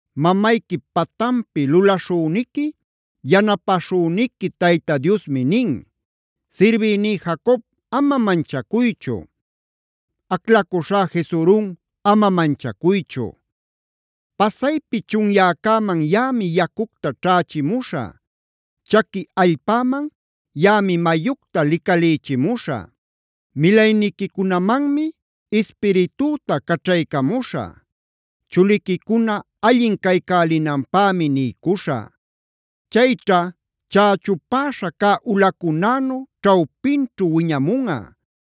Mamayquip patanpi lulaśhüniqui, yanapäśhüniqui Tayta Diosmi nin: Sirbïní Jacob ama manchacuychu; aclacuśhá Jesurunab ama manchacuychu. Pasaypi chunyäcäman yaꞌami yacucta ćhächimuśhä; chaqui allpäman yaꞌami mayucta licalïchimuśhä. Milayniquicunamanmi Ispiritüta caćhaycamuśhä; chuliquicuna allin caycälinanpämi niycuśhä. Chayćha chächupäśha cä ulacunänu ćhawpinćhu wiñamunꞌa;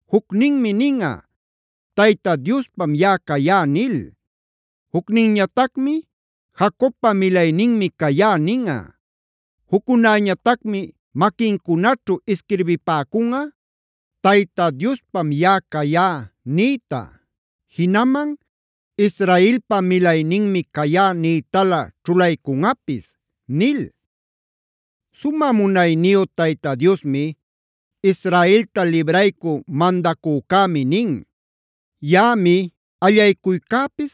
Jucninmi ninꞌa: ‘Tayta Diospam yaꞌa cayá’ nil. Jucninñatacmi: ‘Jacobpa milayninmi cayá’ ninꞌa. Juccunäñatacmi maquincunaćhu isquirbipäcunꞌa: ‘Tayta Diospam yaꞌa cayá’ nïta. Jinaman ‘Israelpa milayninmi cayá’ nïtalä ćhulaycunꞌapis” nil. Sumä munayniyu Tayta Diosmi, Israelta libraycü mandacücämi nin: “Yaꞌami allaycuycäpis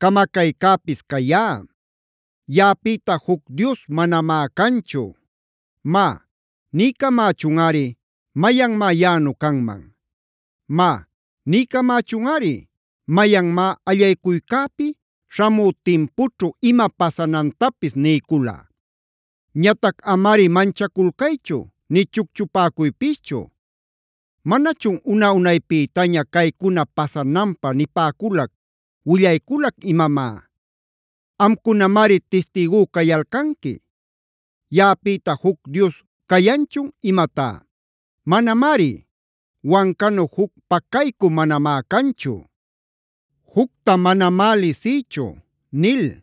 camacaycäpis cayá.d Yaꞌapïta juc dios manamá canchu. Má, niycamächunꞌari, ¿mayanmá yaꞌanu canman? Má, niycamächunꞌari, ¿mayanmá allaycuycäpi śhamü timpućhu ima pasanantapis niycula? Ñatac amari manchaculcaychu nï chucchupäcuypischu. ¿Manachun una-unaypïtaña caycuna pasananpä nipäculac, willayculac imamá? Amcunamari tistïgú cayalcanqui. Yaꞌapïta ¿juc dios cayanchun imatá? Manamari. Wancanu juc pacaycü manamá canchu; jucta manamá lisïchu” nil.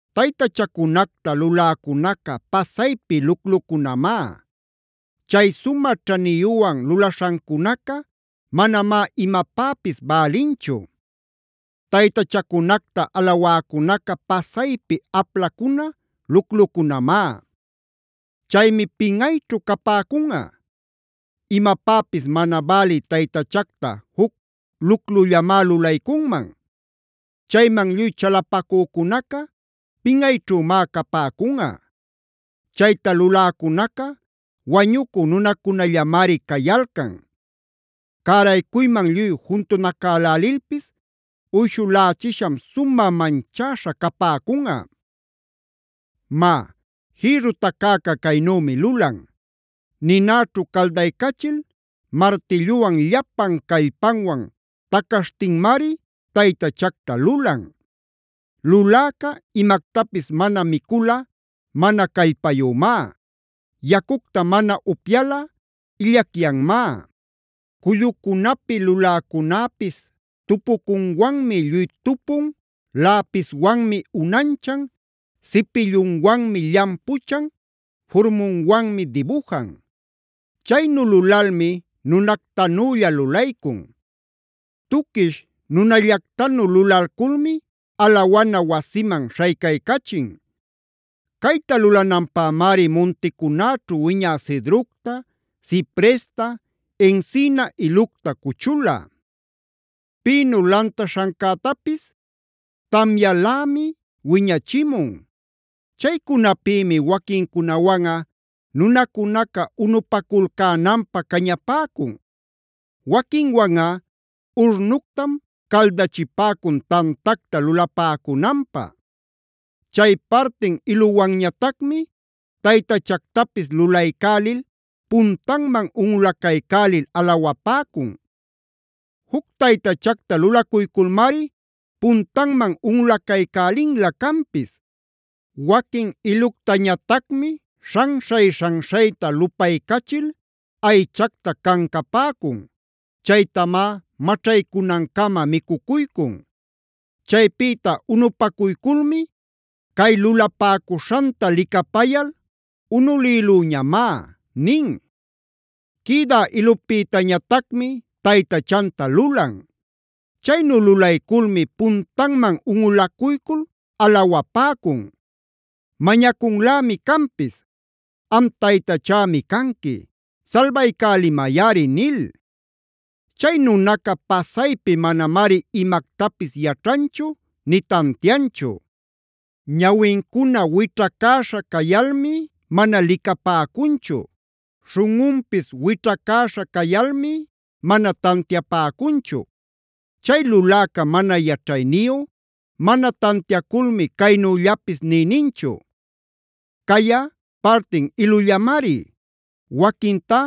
Taytachacunacta luläcunacae pasaypi luclucunamá. Chay sumä ćhaniyüwan lulaśhancunaca manamá imapäpis bälinchu. Taytachacunacta alawäcunaca pasaypi aplacuna luclucunamá. Chaymi pinꞌayćhu capäcunꞌa. Imapäpis mana bälï taytachacta juc luclullamá lulaycunman. Chayman lluy chalapacücunaca pinꞌayćhümá capäcunꞌa. Chayta luläcunaca wañucü nunacunallamari cayalcan. Cäraycuyman lluy juntunacälälilpis uyshulächisham sumä manchäśha capäcunꞌa. Má, jïrru tacäca caynümi lulan: ninäćhu caldaycachil martilluwan llapan callpanwan tacaśhtinmari taytachacta lulan. Luläca imactapis mana miculꞌa mana callpayümá; yacucta mana upyalꞌa illacyanmá. Cullucunapi luläcunäpis tupucunwanmi lluy tupun, läpiswanmi unanchan, cipilluwanmi llampuchan, furmunwanmi dibujan; chaynu lulalmi nunactanülla lulaycun. Tuquish nunallactanu lulalculmi alawana wasiman śhaycaycachin. Cayta lulananpämari munticunäćhu wiñä cedrocta, cipresta, encina ilucta cuchula; pino lantaśhancätapis tamyälämi wiñachimun. Chaycunapïmi waquincunawanꞌa nunacunaca unupaculcänanpä cañapäcun; waquinwanꞌa urnuctam caldachipäcun tantacta lulapäcunanpä. Chay partin iluwanñatacmi taytachactapis lulaycälil puntanman unꞌulacaycälil alawapäcun. Juc taytachacta lulacuyculmari puntanman unꞌulacaycälinlä canpis. Waquin iluctañatacmi śhanśhay-śhanyayta lupaycachil aychacta cancapäcun; chaytamá maćhaycunancama micucuycun. Chaypïta unupacuyculmi: “¡Cay lulapäcuśhanta licapayal unulïlüñamá!” nin. Quïdä ilupïtañatacmi taytachanta lulan; chaynu lulayculmi puntanman unꞌulacuycul alawapäcun. Mañacunlämi canpis: “Am taytachämi canqui; salbaycälimayꞌari” nil. Chay nunaca pasaypi manamari imactapis yaćhanchu nï tantianchu. Ñawincuna wićhacäśha cayalmi mana licapäcunchu. Śhunꞌunpis wićhacäśha cayalmi mana tantiapäcunchu. Chay luläca mana yaćhayniyu, mana tantiaculmi caynüllapis nï ninchu: “Cayꞌa, partin ilullamari. Waquintá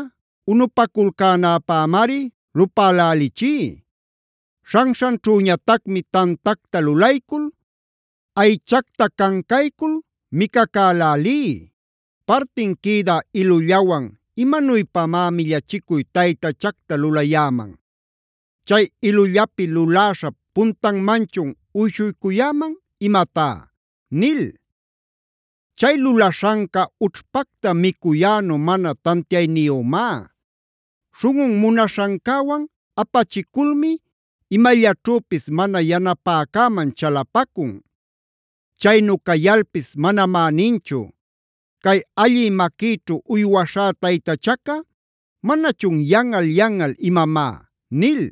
unupaculcänäpämari lupälälichí; śhanśhanćhüñatacmi tantacta lulaycul, aychacta cancaycul micacälälí. Partin quïdä ilullawan ¿imanuypamá millachicuy taytachacta lulayäman? ¿Chay ilullapi luläśhap puntanmanchun uyshuycuyäman imatá?” nil. Chay lulaśhanca ućhpacta micuyänu mana tantiayniyümá. Śhunꞌun munaśhancäwan apachiculmi imallaćhüpis mana yanapäcäman chalapacun. Chaynu cayalpis manamá ninchu: “Cay allï maquïćhu uywaśhá taytachaca, ¿manachun yanꞌal-yanꞌal imamá?” nil.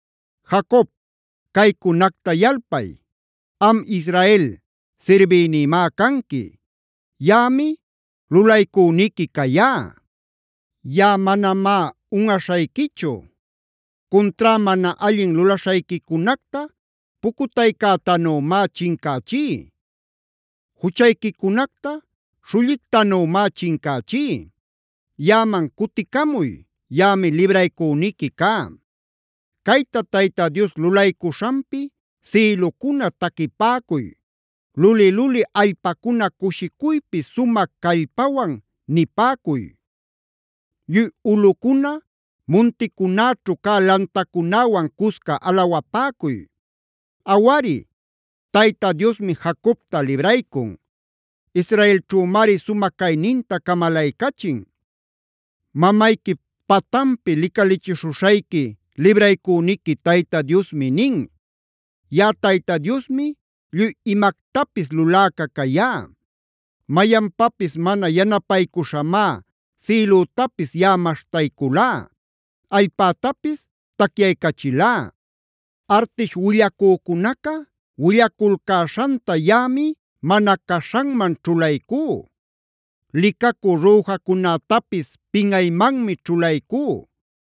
Jacob, caycunacta yalpay. Am Israel, sirbïnïmá canqui. Yaꞌami lulaycüniqui cayá. Yaꞌa manamá unꞌaśhayquichu. Cuntrá mana allin lulaśhayquicunacta pucutaycätanümá chincächí; juchayquicunacta śhullictanümá chincächí. Yaꞌaman cuticamuy; yaꞌami libraycüniqui cá. Cayta Tayta Dios lulaycuśhanpi sïlucuna taquipäcuy. Luli-luli allpacuna cushicuypi sumä callpawan nipäcuy. Lluy ulꞌucuna munticunäćhu cä lantacunäwan cusca alawapäcuy. Awari, Tayta Diosmi Jacobta libraycun; Israelćhümari sumä cayninta camalaycachin. Mamayquip patanpi licalichishuśhayqui, libraycüniqui Tayta Diosmi nin: “Yaꞌa Tayta Diosmi lluy imactapis luläca cayá. Mayanpapis mana yanapaycuśhamá sïlütapis yaꞌa maśhtayculá, allpätapis tacyaycachilá. Artish willacücunaca willaculcäśhanta yaꞌami mana caśhanman ćhulaycú. Licacü rüjacunätapis pinꞌaymanmi ćhulaycú.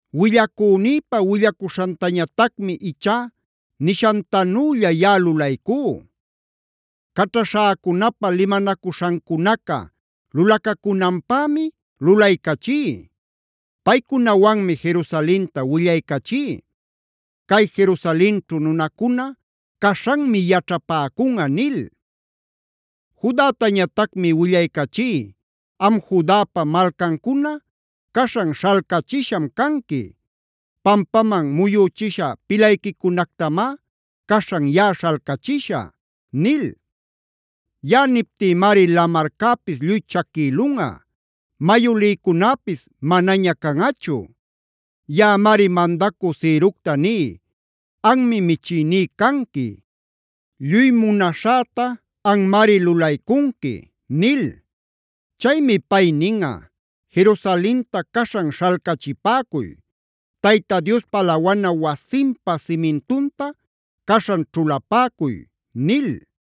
Willacünïpa willacuśhantañatacmi ichá nishantanülla yaꞌa lulaycú; caćhaśhäcunapa limanacuśhancunaca lulacacunanpämi lulaycachí. Paycunawanmi Jerusalenta willaycachí: ‘Cay Jerusalenćhu nunacuna caśhanmi yaćhapäcunꞌa’ nil. Judatañatacmi willaycachí: ‘Am Judapa malcancuna, caśhan śhalcachisham canqui; pampaman muyüchisha pilayquicunactamá caśhan yaꞌa śhalcachishä’ nil. Yaꞌa niptïmari lamarcäpis lluy chaquïlunꞌa; mayu lïcunäpis manaña canꞌachu. Yaꞌamari mandacü Cirocta ní: ‘Anmi michïní canqui. Lluy munaśhäta anmari lulaycunqui’ nil.g Chaymi pay ninꞌa: ‘Jerusalenta caśhan śhalcachipäcuy. Tayta Diospa alawana wasinpa simintunta caśhan ćhulapäcuy’” nil.